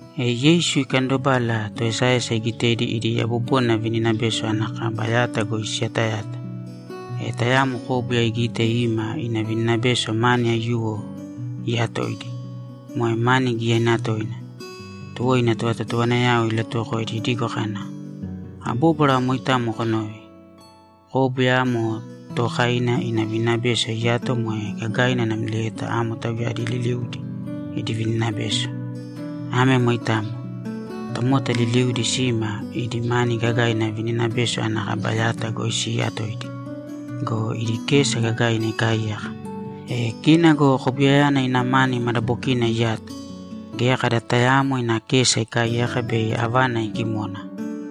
E Yeisu ikandobala, toesaesa igitedi idi yabobona vininabeso ana kaba yata goi siyatayata. E tayamo kóbuya igite ima ina vininabeso mani aiyuwo iyatoidi, moe mani giyaina toina. Tuwo ina tovatotowanayao ilatuwokoidi idigo kana, ‘Abóbwara moitamo konōve: Kóbuya amo tookaina ina vininabeso iyato moe gagaina namlieta amo tauyadi liliudi idi vininabeso. Ame moitamo. Tomota liliudi sima idi mani gagaina vininabeso ana kaba yata goi siiyatoidi go, idi kesa gagaina ikaaiyaka. E kina go kobuyayana ina mani madabokina iyato. Geya kada tayaamo ina kesa ikaaiyaka bei avana igimona.’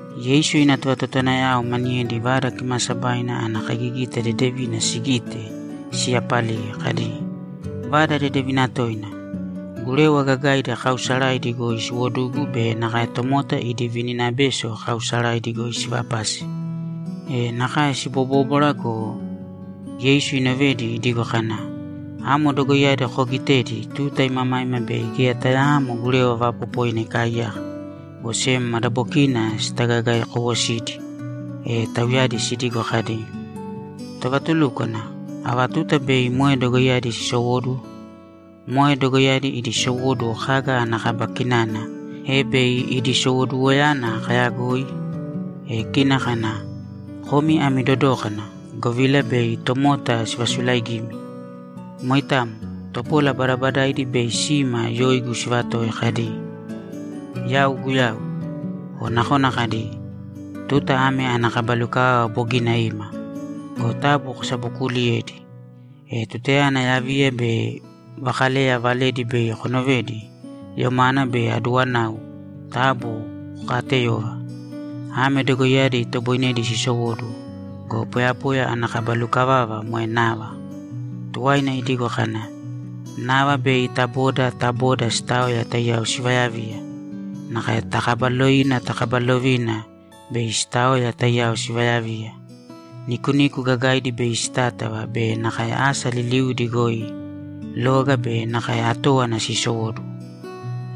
Yeisu ina tovatotowanayao maniyedi Vada Kimaasabaina ana kaigigita dedevina sigite, siyapaliye kadi, ‘Vada dedevina toina. Gurewa gagaidi kaausaraidi goi siwodugu be nakae tomota idi vininabeso kaausaraidi goi sivapase.’ E nakae sibobóbwara go, Yeisu inovedi idigo kana, ‘Amo dogoiyadi koogitedi tuta imamaima bei geya tayaamo gurewa vaapopoina ikaaiyaka, go sem madabokina sitagaegaekowosidi.’ E tauyadi sidigo kadi, ‘Tovatulúkwana, ava tuta bei moe dogoiyadi sisowóduwo? Moe dogoiyadi idi sowóduwo kaga ana kaba kinana, e bei idi sowoduwoyana kaayagoi?’ E kina kana, ‘Komi ami dodōkana, govila bei tomota sivasulaigimi. Moitamo. Topola badabadaidi bei sima yoigu sivatoi kadi, “Yau Guyau.” O nakona kadi, “Tuta ame ana kaba lukavava bogina ima.” Go taabu kosabokuuliyēdi. E tutayana yaviya be vakaleya valedi bei konovedi yomana be aduwanau, taabu kokaateyōva. Ame dogoiyadi itoboinedi sisowóduwo go, poyapoya ana kaba lukavava moe nava.’ Tuwaina idigo kana, ‘Nava bei ta boda ta boda sitaoya taiyao sivayaviya. Nakae ta kaba lovina ta kaba lovina bei sitaoya taiyao sivayaviya. Nikuniku gagaidi bei sitátava be nakae asa liliudi goi loga be nakae atówana sisowóduwo.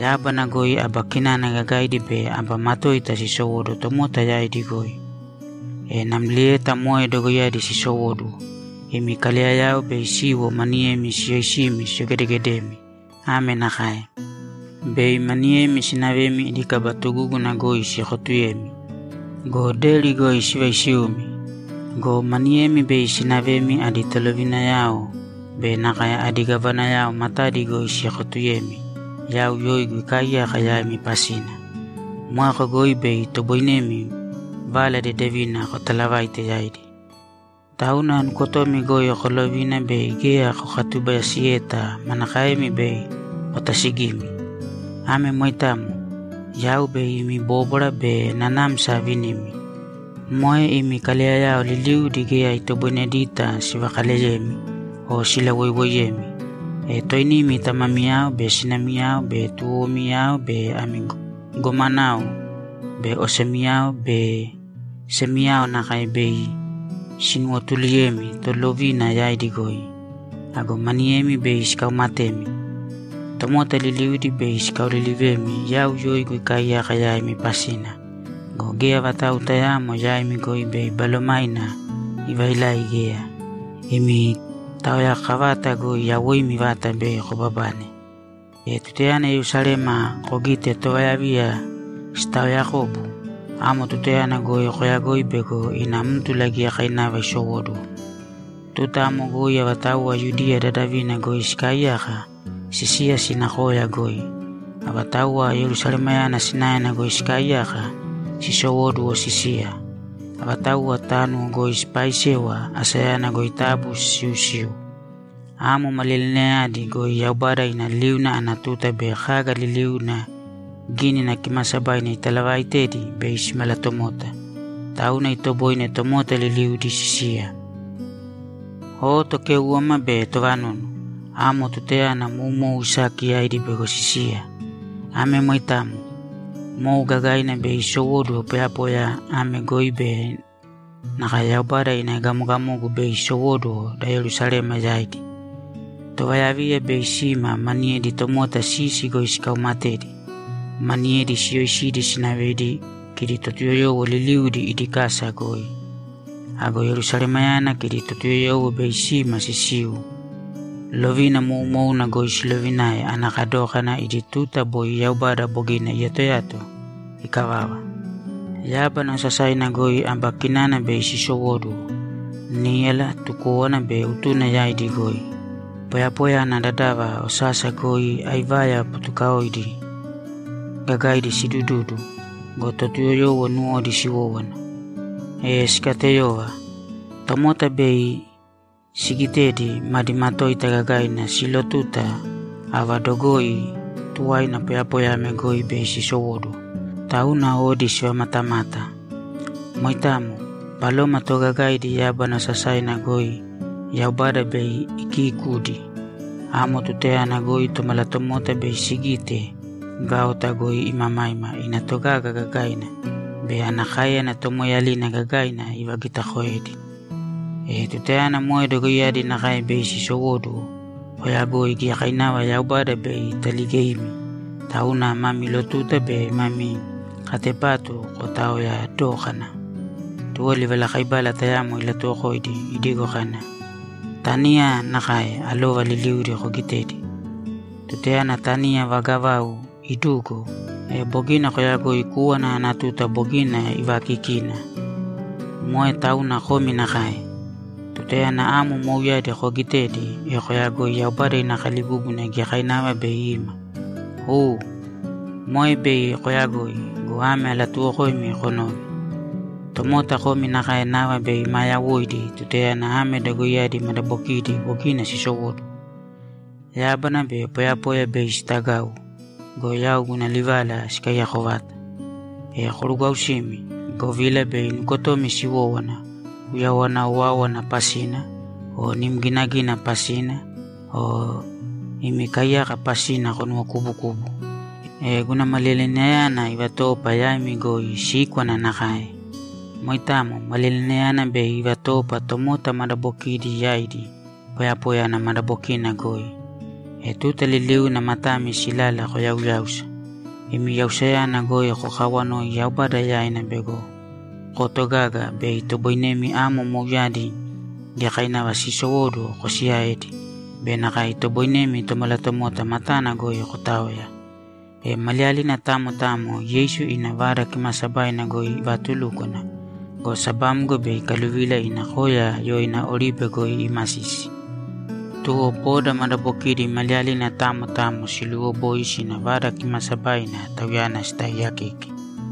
Yábana goi aba kinana gagaidi be aba matoita sisowóduwo tomota yaidi goi. E namlieta moe dogoiyadi sisowóduwo, imi kaleyayao bei siwo maniyemi siyoisimi siyogedegedemi ame nakae: Bei maniyemi sinavemi idi kaba tugúguna goi siekotuyemi go, deri goi sivaisiumi. Go maniyemi bei sinavemi adi tolovinayao be nakae adi gavanayao matadi goi siekotuyemi yau yoigu ikaaiyaka yaimi pasina. Moeko goi bei itoboinemi Vala Dedevina kotalavaite yaidi. Tauna nukotomi goi kolovīna bei geya kokatubayasiyeta manakaemi bei kotasigimi. Ame moitamo. Yau bei imi bóbwara be nanamsa avinimi. Moe imi kaleyayao liliudi geya itoboinedita sivakaleyemi o silawoiwoiyemi. E toinimi tamamiyao be sinamiyao be tuwowomiyao be ami gomanao be osemiyao be semiyao nakae bei sinuwotuluyemi tolovina yaidi goi. Ago maniyemi bei sikaumatemi. Tomota liliudi bei sikaolilivemi yau yoigu ikaaiyaka yaimi pasina go, geya vatau tayaamo yaimi goi bei balomaina ivailai geya. Imi taoyakavata goi yawoimi vata bei kobabane. E tutayana Yerusalema kogite tovayaviya sitaoyakobu, amo tutayana goi koyagōi bego aná mtula giyakainava isowóduwo. Tuta amo goi avatauwa Yudiya dadavina goi sikaaiyaka, sisīya sīna koya goi. Avatauwa Yerusalemayana sinaena goi sikaaiyaka, sisowōduwo sisīya. Avatauwa tánuwo goi sipaaisewa, asayana goi taabu sisiusīu. Amo maliyalinayadi goi Yaubada ina liuna ana tuta be kaga liliuna Gínina Kimaasabaina italavaaitedi bei simalatomota. Tauna itoboine tomota liliudi sisiya. O tokéuwama be tovanunu! Amo tutayana moumou isaki yaidi bego sisiya. Ame moitamo. Mou gagaina bei isowóduwo poyapoya ame goi be nakae Yaubada ina egamogamogu bei isowóduwo da Yerusalema yaidi. Tovayaviya bei sima maniyedi tomota sisi goi sikaumatedi. Maniyedi siyoisidi sinavedi kidi Totuyoyowo liliudi idi kasa goi. Ago Yerusalemayana kidi Totuyoyowo bei sima sisiu lovina moumouna goi silovinae ana kadókana idi tuta boi Yaubada bogina iyatoyato ikavava. Yábana osasaina goi aba kinana bei sisowóduwo níyala, tukówana be utuna yaidi goi. Poyapoya ana dadava osasa goi aivaya butukaodi gagaidi sidududu go, Totuyoyowo nuwodi siwówana, e sikateyova. Tomota bei sigitedi, madi matoita gagaina silotuta ava dogoi tuwaina poyapoya ame goi bei sisowóduwo, tauna odi sivamatamata. Moitamo. Baloma toogagaidi yábana osasaina goi Yaubada bei ikiikudi. Amo tutayana goi Tomalatomota bei sigite gaota goi imamaima ina togaga gagaina be ana káeyana tomoeeyalina gagaina ivagitakoedi. E tutayana moe dogoiyadi nakae bei sisowóduwo, koyagoi giyakainava Yaubada bei italigeimi, tauna mami lotuta be mami katepatu kotaoya dōkana.’ Tuwo livalakaibala tayamo ilatuwokoidi idigo kana, ‘Taniya nakae alova liliudi kogitēdi. Tutayana taniya vaga vau idugo, e bogina koyagoi kúwana ana tuta bogina ivaakikina. Moe tauna komi nakae. Tutayana amo mouyadi koogitedi, e koyagōi Yaubada ina kalibúbuna giyakainava bei ima. U, moe bei kooyagoi go, ame alatuuwokoimi konōve: Tomota komi nakae nava bei maa yawoidi tutayana ame dogoiyadi madabokidi bogina sisowóduwo. Yábana be poyapoya bei sitagau go, yau guna livala sikaiyako vata. E korugwausīmi, govila bei nukotomi siwówana uyawana owáowana pasina o nim ginagina pasina o imi kaiyaka pasina konuwokubukubu, e guna maliyalinayana ivatoopa yaimi goi síkwana nakae. Moitamo. Maliyalinayana bei ivatoopa tomota madabokidi yaidi poyapoya ana madabokina goi. E tuta liliuna matami silala koyauyāusa. Imi yausayana goi kokawanōi Yaubada yaina bego kotogaga bei itoboinemi amo mouyadi giyakainava siisowóduwo kosiyaedi be nakae itoboinemi Tomalatomota matana goi kotaoya.’ E maliyalina tamo tamo Yeisu ina Vada Kimaasabaina goi ivaatulúkwana go, sabamgo bei ikaluvila ina Koya yoina Oribe goi iimasisi. Tuwo boda madabokidi maliyalina tamo tamo siluuwoboi sina Vada Kimaasabaina Tauyana sitaaiyakeke.